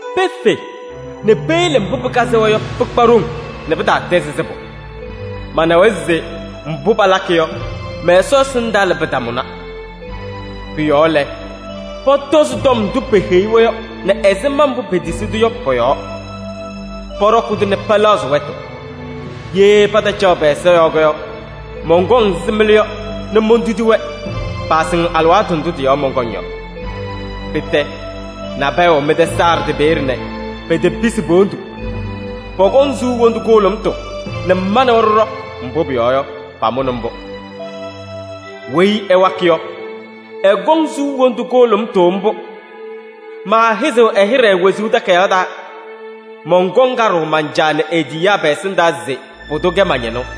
Pefe nɛ peyele mbʋ pɩkazɩ-wɛ yɔ, pɩkpa ɖoŋ nɛ pɩtaatɛzɩ sɩbʋ: manawa se mbʋ palakɩ yɔ, mɛ-Ɛsɔ ɛsɩndaa lɛ, pɩtamʋna. Pʋ-yɔɔ lɛ, pɔtɔzɩ tɔm ndʋ peheyi-wɛ yɔ nɛ ɛzɩma mbʋ petisi-tʋ yɔ pɔ-yɔɔ. Pɔɖɔkɩ-tʋ nɛ pɛlɛɣzɩ wɛtʋ. Ye patacaɣ pɛ-ɛza yɔɔ yɔ, mɔnkɔŋ ɛzɩ mɩlʋ yɔ nɛ montudi-wɛ, paasɩŋ alɩwaatʋ ndʋ tɩ-yɔɔ mɔnkɔŋ yɔ. Pɩtɛ, nabɛyɛ wɛ mɩ-tɛ Saardɩ peeye nɛ petepisi po-wondu. Pɔkɔŋ suu wondu kʋhʋlʋmʋtʋ nɛ ma nɛ wɛ ɖɩɖɔ, mbʋ pʋyɔɔ yɔ, pamʋnɩ mbʋ. ‘Weyi ɛwakɩ yɔ, ɛkɔŋ suu wondu kʋhʋlʋmʋtʋ mbʋ. Maahɩzɩɣ ɛ-hɩɖɛ wezuu takayaɣ taa. Mɔnkɔŋ kaɖʋʋ man-Caa nɛ e-tiyiyaa pɛ-ɛsɩndaa se pʋdʋ kɛ ma-ñɩnʋ.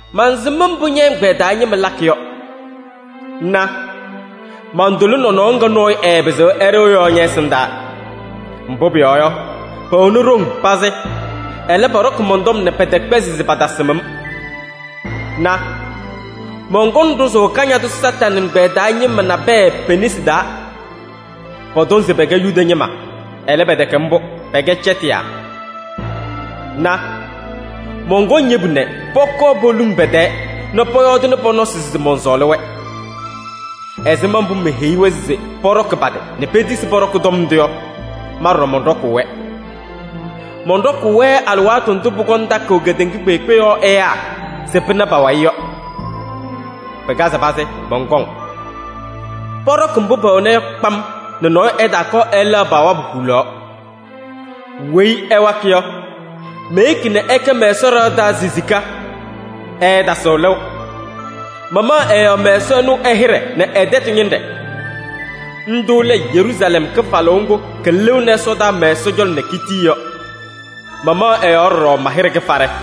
mansɩm mbʋ ñɛ-ɛgbɛyɛ taa ñɩma lakɩ yɔ. Na: mantʋlɩ nɔnɔɔ ŋga nɔɔyʋ ɛɛpɩzɩɣ ɛɖɩɣ yɔ ñɛ-ɛsɩndaa. Mbʋ pʋyɔɔ yɔ, pɛwɛnɩ ɖoŋ pazɩ, ɛlɛ, pɔɖɔkɩ mɔn-tɔm nɛ pɛtɛkpɛzɩ se patasɩm-m. Na! Mɔnkɔŋ ɖʋzʋʋ Kañadʋ Satanɩ ɛgbɛyɛ taa ñɩma nabɛyɛ pe-nesi taa. Pɔtɔŋ se pɛkɛ Yuda ñɩma, ɛlɛ, pɛtɛkɛ mbʋ, pɛkɛ cɛtɩyaa. Na! Mɔnkɔŋ yebu nɛ pɔkɔɔ poluŋ pɛ-tɛɛ nɛ pɔyɔɔdɩnɩ pɔ-nɔsɩ se mɔnsɔɔlɩ-wɛ. Ɛzɩma mbʋ meheyi-wɛ se pɔɖɔkɩ pa-tɩ nɛ petisi pɔɖɔkɩ tɔm ndʋ yɔ, ma ɖɔɖɔ mɔnɖɔkʋʋ-wɛ. Mɔnɖɔkʋʋ-wɛ alɩwaatʋ ndʋ pʋkɔŋ takʋʋ kedeŋa kpeekpe yɔɔ ɛyaa se pɩna pa-wayɩ yɔ. Pɩkazɩ pazɩ, mɔnkɔŋ. Pɔɖɔkɩ mbʋ pɛwɛna yɔ kpam nɛ nɔɔyʋ ɛtaakɔɔ ɛlɛɣ pa-wabʋ hulaɣ. ‘Weyi ɛwakɩ yɔ, meyeki nɛ ɛkɛ mɛ-Ɛsɔ ɖɩɣa taa sisika, ɛɛtasɩɣ lɩʋ. Mamaɣ ɛ-yɔɔ mɛ-Ɛsɔ ɛnʋ ɛ-hɩɖɛ nɛ ɛ-tɛtʋ ñɩnɖɛ: ndʋʋ lɛ Yeruusalɛm kɩfalʋʋ ŋgʋ kɩlɩɣnɩ ɛsɔdaa mɛ-Ɛsɔ cɔlɔ nɛ kitiki yɔ. Mamaɣ ɛ-yɔɔ ɖɔɖɔ ma-hɩɖɛ kɩfaɖɛ.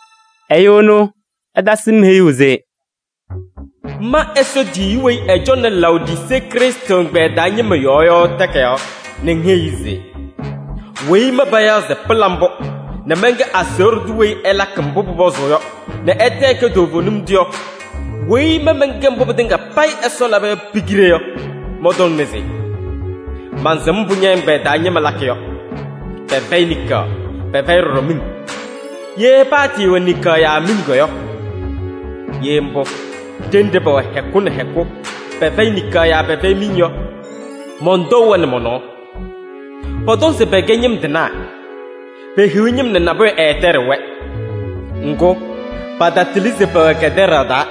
Ɛyʋ ɛnʋ ɛtasɩ-m heyuu se: “Ma Ɛsɔ tiyiyu weyi ɛcɔŋnɩ Laodisee Krɩstʋ ɛgbɛyɛ taa ñɩma yɔɔ yɔ takayaɣ nɛ ŋheyi-i se: ‘Weyi ma payaɣ se Pɩla Mbʋ nɛ mɛnkɛ aseɣɖe tʋ weyi ɛlakɩ mbʋ pʋpɔzʋʋ yɔ nɛ ɛtɛ ɛkɛ toovenim tʋ yɔ, weyi ma mɛnkɛ mbʋ pɩtɩŋa payɩ Ɛsɔ laba yɔ pi-kiɖe yɔ, mɔntɔŋnɩ se: mansɩm mbʋ ñɛ-ɛgbɛyɛ taa ñɩma lakɩ yɔ: pɛfɛyɩ niŋkaɣ, pɛfɛyɩ ɖɔɖɔ miŋ. Ye paatɩɩwɛ niŋkaɣ yaa miŋ yɔ! Ye mbʋ, ɖenɖe pɛwɛ hɛkʋ nɛ hɛkʋ, pɛfɛyɩ niŋkaɣ yaa pɛfɛyɩ miŋ yɔ, mɔntɔʋ-wɛ nɛ mɔ-nɔɔ. Pɔtɔŋ se pɛkɛ ñɩm tɩnaa, pehiɣ ñɩm nɛ nabʋyʋ ɛɛtɛɖɩɣ-wɛ. Ŋgʋ, patatɩlɩ se pɛwɛ kɛtɛɖaɣ taa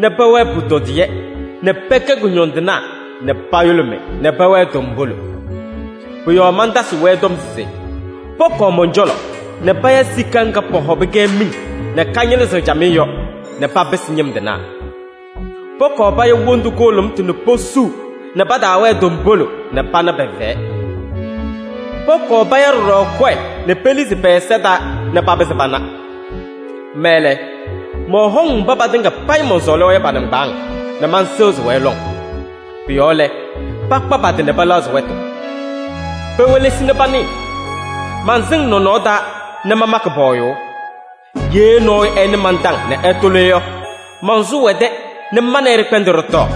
nɛ pɛwɛɛ pʋtɔdɩyɛ nɛ pɛkɛ kʋñɔndɩnaa nɛ payʋlʋmɩ nɛ pɛwɛɛ tombolo. Pʋ-yɔɔ mantasɩɣ-wɛ tɔm se pɔkɔɔ mɔn-cɔlɔ nɛ paya sika ŋga pɔhɔbɩ-kɛ miŋ nɛ kañɩlɩzɩɣ camɩyɛ yɔ nɛ papɩsɩ ñɩm tɩnaa. Pɔkɔɔ paya wondu kʋhʋlʋmʋtʋ nɛ posuu nɛ pataawɛɛ tombolo nɛ pana pɛ-fɛyɛ. Pɔkɔɔ paya ɖɔɖɔ kɔyɛ nɛ pelizi pɛ-ɛza taa nɛ papɩzɩ pana. Ma lɛ, mɔhɔŋ mba patɩŋa payɩ mɔnsɔɔlɩ-wɛ yɔ pa-nɩŋgbaaŋ nɛ mansɩɣzɩ-wɛ lɔŋ. Pʋ-yɔɔ lɛ, pakpa pa-tɩ nɛ pɛlɛɣzɩ wɛtʋ. Pewelesi nɛ panɩɩ: mansɩŋ nɔnɔɔ taa nɛ mamakɩ pɔɔyʋʋ. Ye nɔɔyʋ ɛnɩ man-taŋ nɛ ɛtʋlɩ yɔ, mansʋʋ ɛ-tɛ nɛ ma nɛ ɩ ɖɩkpɛndɩ ɖɩtɔɔ.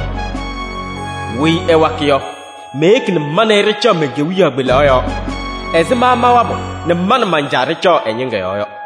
‘Weyi ɛwakɩ yɔ, meyeki nɛ ma nɛ ɩ ɖɩcaɣ men-kewiyaɣ kpelaɣ yɔɔ ɛzɩ ma mawabʋ nɛ ma nɛ man-Caa ɖɩcaɣ ɛ-ñɩŋga yɔɔ yɔ.